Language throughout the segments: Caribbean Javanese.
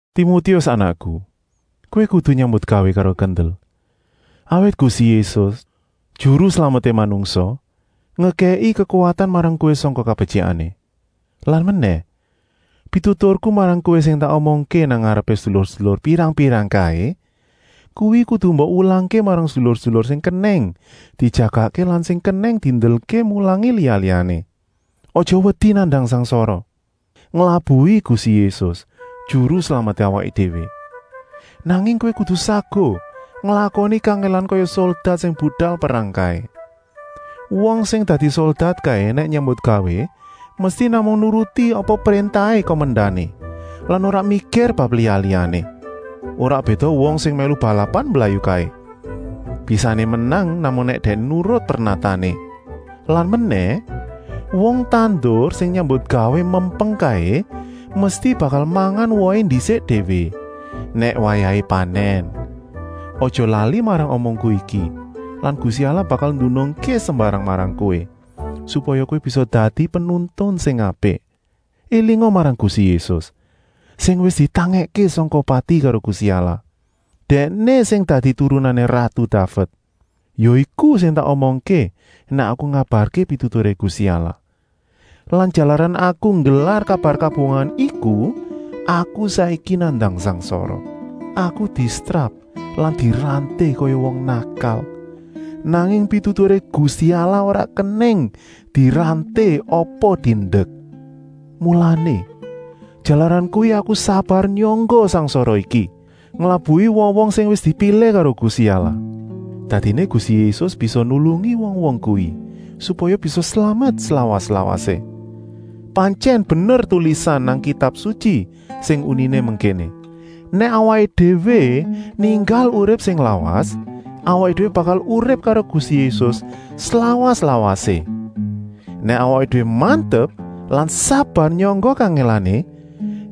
Timotius anakku, kowé kudu nyambutgawé karo kendel, awit Gusti Yésus, Juru Slameté manungsa, ngekèki kekuwatan marang kowé sangka kabetyikané. Lan menèh, pituturku marang kowé sing tak omongké nang ngarepé sedulur-sedulur pirang-pirang kaé, kuwi kudu mbok wulangké marang sedulur-sedulur sing kenèng dijagakké lan sing kenèng diendelké mulangi liya-liyané. Aja wedi nandang sangsara nglabuhi Gusti Yésus, Juru Slameté awaké déwé. Nanging kowé kudu saguh nglakoni kangèlan kaya soldat sing budal perang kaé. Wong sing dadi soldat kaé nèk nyambutgawé mesti namung nuruti apa préntahé kumendané lan ora mikir bab liya-liyané. Ora béda wong sing mèlu balapan mblayu kaé. Bisané menang namung nèk dèkné nurut pernatané. Lan menèh, wong tandur sing nyambutgawé mempeng kaé mesti bakal mangan wohé ndisik déwé, nèk wayahé panèn. Aja lali marang omongku iki lan Gusti Allah bakal ndunungké sembarang marang kowé, supaya kowé bisa dadi penuntun sing apik. Elinga marang Gusti Yésus, sing wis ditangèkké sangka pati karo Gusti Allah. Dèkné sing dadi turunané ratu Daved. Ya iku sing tak omongké nèk aku ngabarké pituturé Gusti Allah. Lan jalaran aku nggelar kabar kabungahan iku aku saiki nandang sangsara. Aku disetrap lan diranté kaya wong nakal. Nanging pituturé Gusti Allah ora kenèng diranté apa diendek. Mulané, jalaran kuwi aku sabar nyangga sangsara iki, nglabuhi wong-wong sing wis dipilih karo Gusti Allah. Dadiné Gusti Yésus bisa nulungi wong-wong kuwi, supaya bisa slamet slawas-lawasé. Pantyèn bener tulisan nang Kitab Sutyi sing uniné ngéné: “Nèk awaké déwé ninggal urip sing lawas, awaké déwé bakal urip karo Gusti Yésus slawas-lawasé. Nèk awaké déwé mantep lan sabar nyangga kangèlané,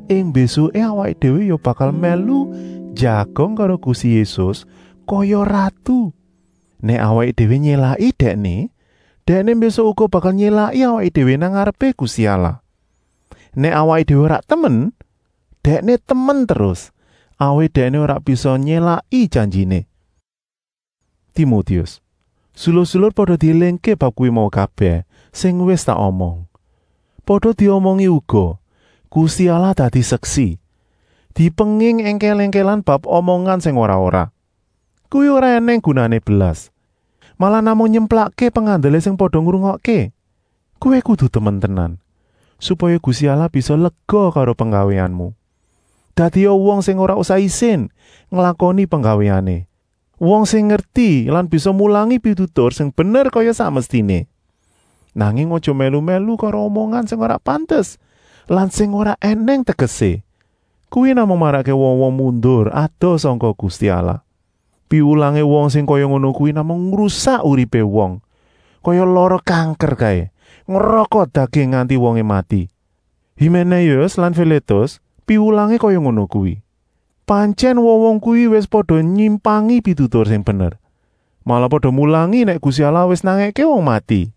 ing mbésuké awaké déwé ya bakal mèlu njagong karo Gusti Yésus kaya ratu. Nèk awaké déwé nyélaki Dèkné, Dèkné mbésuk uga bakal nyélaki awaké déwé nang ngarepé Gusti Allah. Nèk awaké déwé ora temen, Dèkné temen terus, awit Dèkné ora bisa nyélaki janjiné.” Timotius, sedulur-sedulur pada diélingké bab kuwi mau kabèh sing wis tak omong. Pada diomongi uga, Gusti Allah dadi seksi, dipenging èngkèl-èngkèlan bab omongan sing ora-ora. Kuwi ora ènèng gunané blas, malah namung nyemplakké pengandelé sing pada ngrungokké. Kowé kudu temen tenan, supaya Gusti Allah bisa lega karo penggawéanmu. Dadia wong sing ora usah isin nglakoni penggawéané, wong sing ngerti lan bisa mulangi pitutur sing bener kaya sak mestiné. Nanging aja mèlu-mèlu karo omongan sing ora pantes lan sing ora ènèng tegesé. Kuwi namung marakké wong-wong mundur adoh sangka Gusti Allah. Piwulangé wong sing kaya ngono kuwi namung ngrusak uripé wong, kaya lara kanker kaé, ngrokot daging nganti wongé mati. Himénéus lan Filétus piwulangé kaya ngono kuwi. Pantyèn wong-wong kuwi wis pada nyimpangi pitutur sing bener. Malah pada mulangi nèk Gusti Allah wis nangèké wong mati.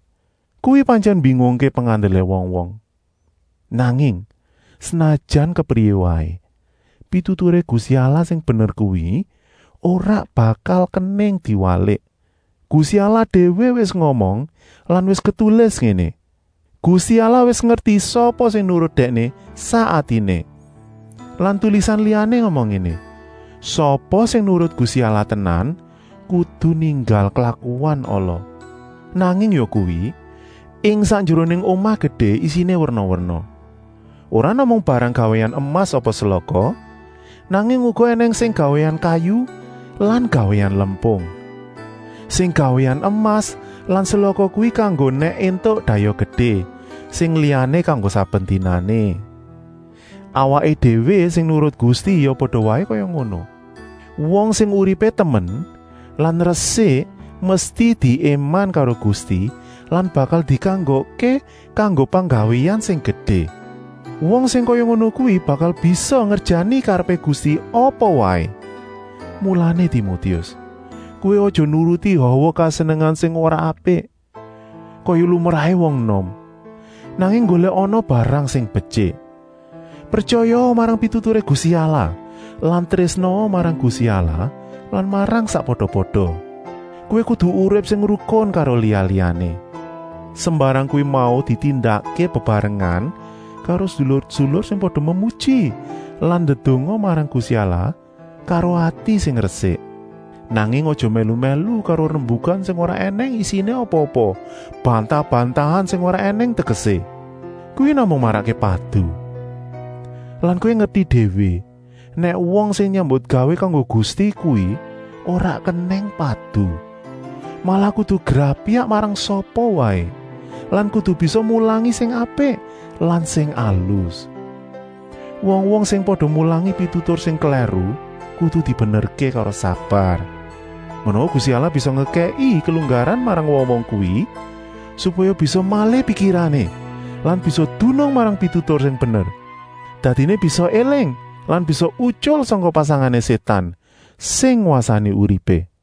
Kuwi pantyèn mbingungké pengandelé wong-wong. Nanging, senajan kepriyé waé, pituturé Gusti Allah sing bener kuwi ora bakal kenèng diwalik. Gusti Allah déwé wis ngomong lan wis ketulis ngéné: “Gusti Allah wis ngerti sapa sing nurut Dèkné sak atiné” lan tulisan liyané ngomong ngéné: “Sapa sing nurut Gusti Allah tenan kudu ninggal klakuan ala!” Nanging yakuwi, ing sak njeroné omah gedé isiné werna-werna, ora namung barang gawéan emas apa selaka, nanging uga ènèng sing gawéan kayu lan gawéan lempung. Sing gawéan emas lan selaka kuwi kanggo nèk éntuk dayoh gedé, sing liyané kanggo saben dinané. Awaké déwé sing nurut Gusti ya pada waé kaya ngono. Wong sing uripé temen lan resik mesti diéman karo Gusti lan bakal dikanggokké kanggo penggawéan sing gedé. Wong sing kaya ngono kuwi bakal bisa ngerjani karepé Gusti apa waé. Mulané Timotius, kowé aja nuruti hawa kesenengan sing ora apik, kaya lumrahé wong enom, nanging nggolèkana barang sing betyik. Pretyayaa marang pituturé Gusti Allah lan trésnaa marang Gusti Allah lan marang sakpada-pada. Kowé kudu urip sing rukun karo liya-liyané. Sembarang kuwi mau ditindakké bebarengan karo sedulur-sedulur sing pada memuji lan ndedonga marang Gusti Allah karo ati sing resik. Nanging aja mèlu-mèlu karo rembukan sing ora ènèng isiné apa bantah-bantahan sing ora ènèng tegesé. Kuwi namung marakké padu. Lan kowé ngerti déwé nèk wong sing nyambutgawé kanggo Gusti kuwi ora kenèng padu, malah kudu grapyak marang sapa waé lan kudu bisa mulangi sing apik lan sing alus. Wong-wong sing pada mulangi pitutur sing klèru kudu dibenerké karo sabar. Menawa Gusti Allah bisa ngekèki kelunggaran marang wong-wong kuwi supaya bisa malih pikirané lan bisa dunung marang pitutur sing bener. Dadiné bisa éling lan bisa utyul sangka pasangané Sétan, sing ngwasani uripé.